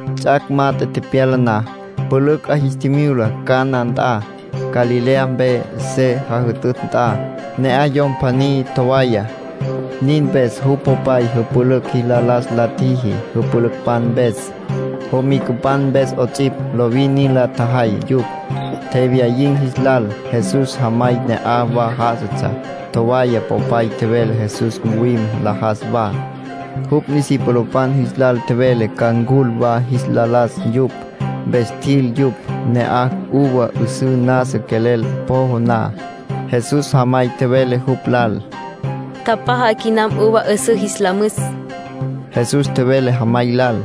Ts'ac' mat'e tepyala na, pülücj 'a jis tjimyula Caná nt'a, Galilea mpe se jütütj nt'a. Ne'aj yom pjaní tjowaya. Nin mpes jupj popay pülücj jis la las la tjiji jüpülücpan mpes, jomicapan mpes 'ots'ipj. Lovin nin la tjajay yupj, tjewyayin̈ jis lal. Jesús jamay ne'aj wa já'asatsja. Tjowaya popay tjevele Jesús ncuwim nlajas wa. Jupj discipulopan jis lal tjevele ca ncul wa jis la las yupj, mpes tjil yupj. Ne'aj uva 'üsǘ nasa quelel pjojo na, Jesús jamay tjevele jupj lal: —Tjapjaja quinam uva 'üsǘ jis la müs. Jesús tjevele jamay lal: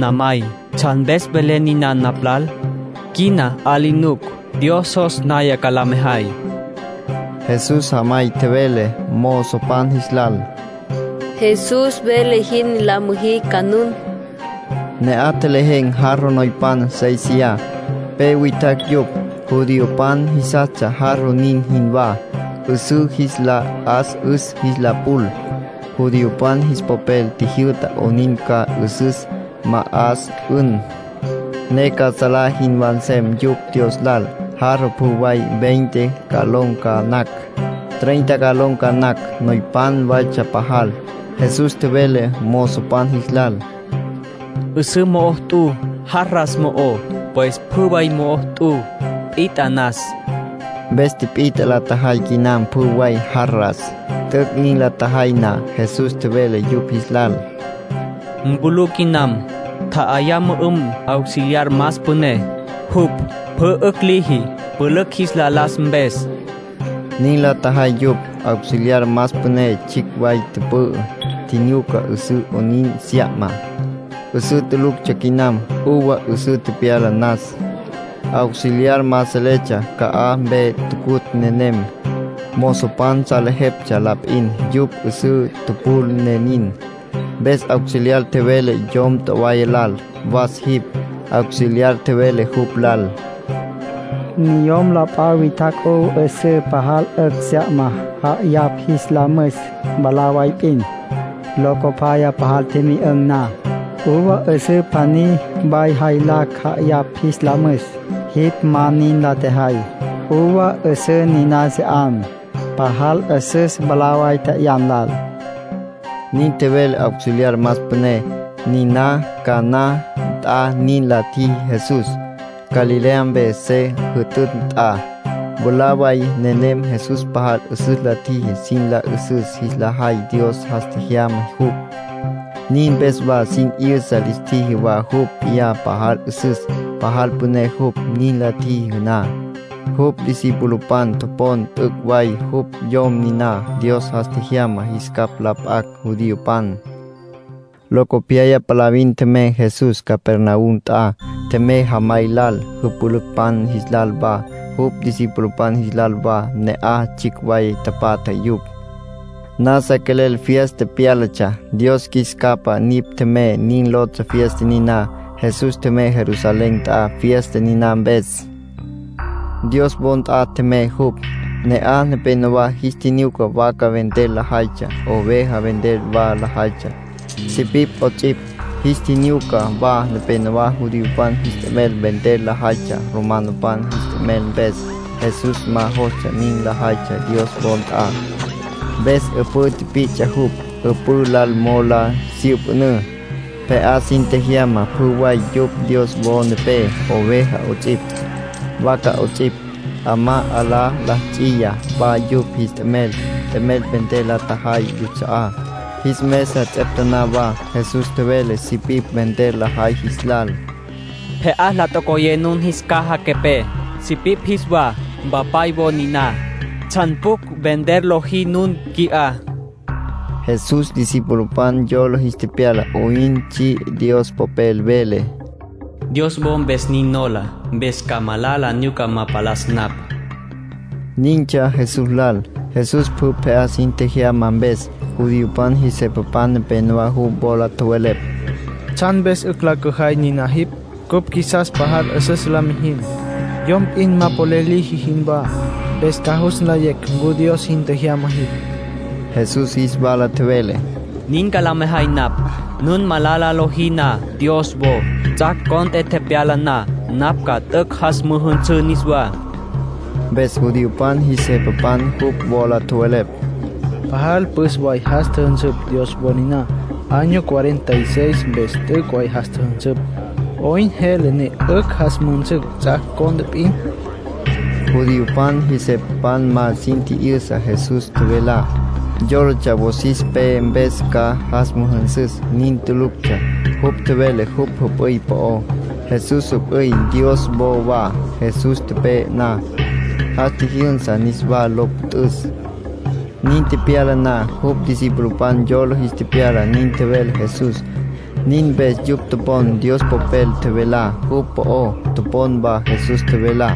—Namay, ¿tsjan mpes velen niná napj lal? Quina 'a li nuc. Dios jos naya ca la mejay. Jesús jamay tjevele mozopan jis lal: —Jesús vele jin la müjí ca nun. Ne'aj tjelejen̈ jarro noypan séisiya, pe witjacj yupj. Judiopan jisastsja jarro nin jinwá, 'üsǘ jis la 'as'üs jis la pul. Judiopan jis popel tjijyü'ta 'onin ca 'üsüs ma'as'ün̈, ne ca salá jinwá nsem yupj Dios lal. Jarro pjü way veinte galón ca nacj, treinta galón ca nacj, noypan waytsja pajal. Jesús tjevele mozopan jis lal: —'Üsǘ mo'o t'u jarras mo'ó, pues pjü way mo'o t'u, pit'a nas. Mpes tipit'a la tjajay quinam pjü way jarras. T'üc' nin la tjajay na, Jesús tjevele yupj jis lal: —Mpulú quinam. Tja'ayá mü'üm auxiliar más püné, jupj pjü 'ücj liji pülücj jis la las mpes. Nin la tjajay yupj. Auxiliar más püné tsjicj way tjümü'ü, tjinyuca 'üsǘ 'oyn sya'ma. 'Üsǘ tuluctsja quinam. Uva 'üsǘ tepyala nas. Auxiliar ma seletsja ca'aj mpe tucutj nenem. Mozopan salejeptsja la p'in. Yupj 'üsǘ tupul ne nin. Mpes auxiliar tjevele yom tjowaya lal: —Was jipj. Auxiliar tjevele jupj lal: —Niyom p'a witjacj uva 'üsǘ pajal 'ücj sya'ma ja'ayapj jis la müs mwalá way p'in. Locopyaya, pajal tjimyü'ün̈ na, uva 'üsǘ pjaní way jaylacj ja'ayapj jis la müs. Jipj ma nin la tjejay. Uva 'üsǘ niná se 'an, pajal 'üsüs mwalá way tje'yan lal —nin tjevele auxiliar más püné. Niná Caná nt'a nin la tjiji Jesús, Galilea mpe se jütütj nt'a. Mwalá way nenem Jesús pajal 'üsüs la tjiji sin la 'üsüs jis la jay Dios jas tjejyama jupj. Nin mpes wa sin 'yüsa lis tjiji wa jupj p'iyá pajal 'üsüs, pajal püné jupj. Nin la tjiji na, jupj discipulopan topon t'üc' way jupj Yom niná Dios jas tjejyama jis capj la p'acj judiopan. Locopyaya palavin tjemey Jesús Capernaum nt'a. Tjemey jamay lal, jüpülücpan jis lal wa, jupj discipulopan jis lal wa. Ne'aj tsjicj way tapatja yupj. Nasa quelel fiesta pyálatsja. “Dios Qjuis Capa Nipj Tjemey” nin lotsja fiesta niná. Jesús tjemey Jerusalén nt'a fiesta niná mpes. Dios wo nt'a tjemey jupj. Ne'aj nepénowa jis tjinyuca vaca vender lajaytsja. Oveja vender wa lajaytsja, sipipj 'ots'ipj. Jis tjinyuca wa nepénowa judiopan jis t'emel vender lajaytsja romanopan jis t'emel mpes. Jesús ma jostsja nin lajaytsja Dios wo nt'a. Mpes 'üpǘ tipi'ts'a jupj. 'Üpǘ lal mo'o la syüpjünǘ, pje'á sin tjejyama pjü way yupj Dios wo nepé, oveja 'ots'ipj, vaca 'ots'ipj. 'Amá 'alá la ts'iya wa yupj jis t'emel, t'emel vender la tjajay yuts'a'á. Jis mesa ts'eptaná wa. Jesús tjevele sipipj vender lajay jis lal: —Pje'á la tocoyé nun jis caja quepé, sipipj jis wa. Mpapay wo niná. ¿Tsjan pjucj vender lojí nun qui'á? Jesús discipulopan yola jis tepyala 'oyn tsji Dios Popel. Vele: “Dios wo mpes nin nola, mpes ca malala nyuca ma palas napj”. Nintsja Jesús lal. Jesús pjü pje'á sin tjejyama mpes, judiopan jis jepapan nepenowá jupj wola tjowelepj: —¿Tsjan mpes 'ücj la cüjay niná jipj? Cupj qjuisas pajal 'üsüs la mijin, yom p'in ma polel liji jinwá, mpes ca jus nlayecj ncu Dios jin tjejyama jipj. Jesús jis wala tjevele: —Nin ca la mejay napj: nun malala lojí na Dios wo, ts'ac' cont'e tepyala na napj ca t'üc' jas müjünsǘ niswá. Mpes judiopan jis jepapan jupj wola tjowelepj: —Pajal püs way jas tjüjünsüpj Dios wo niná. Año cuarenta y seis mpes t'üc' jas tjüjünsüpj. ¿'Oyn jele ne 'ücj jas müjünsün ts'ac' cont'e p'in? Judiopan jis jepapan ma sin tji'yüsa Jesús tjevelá. Yólatsja wosis pe mpes ca jas müjünsüs. Nin tuluctsja. Jupj tjevele jupj jüp'üy po'ó. Jesús jüp'üy Dios wo wa. Jesús tepe'e na, jas tjijyünsa niswá lo püt'üs. Nin tepyala na, jupj discipulopan yola jis tepyala nin tjevele Jesús. Nin mpes yupj topon Dios Popel tjevelá jupj po'ó. Topon wa Jesús tjevelá.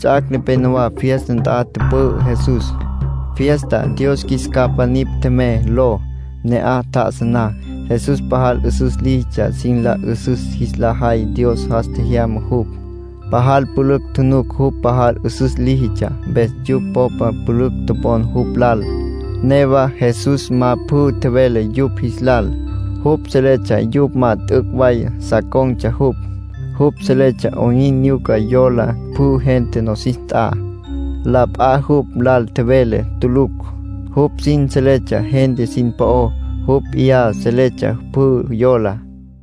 Ts'ac' nepenowá fiesta nt'a tüpü'ü Jesús, fiesta “Dios Qjuis Capa Nipj Tjemey” ló. Ne'aj tjá'asa na, Jesús pajal 'üsüs líjitsja sin la 'üsüs jis la jay Dios jas tjejyama jupj. Pajal pülücj tjunuc jupj pajal 'üsüs líjitsja, mpes yupj popa pülücj topon jupj lal. Newa Jesús ma pjü tjevele yupj jis lal. Jupj seletsja yupj ma t'üc' way sa con̈tsja jupj. Jupj seletsja 'oyn nyuca yola pjü gente nosis nt'a. La p'a jupj lal tjevele tulucj; jupj sin seletsja gente sin po'ó. Jupj p'iyá seletsja pjü yolá.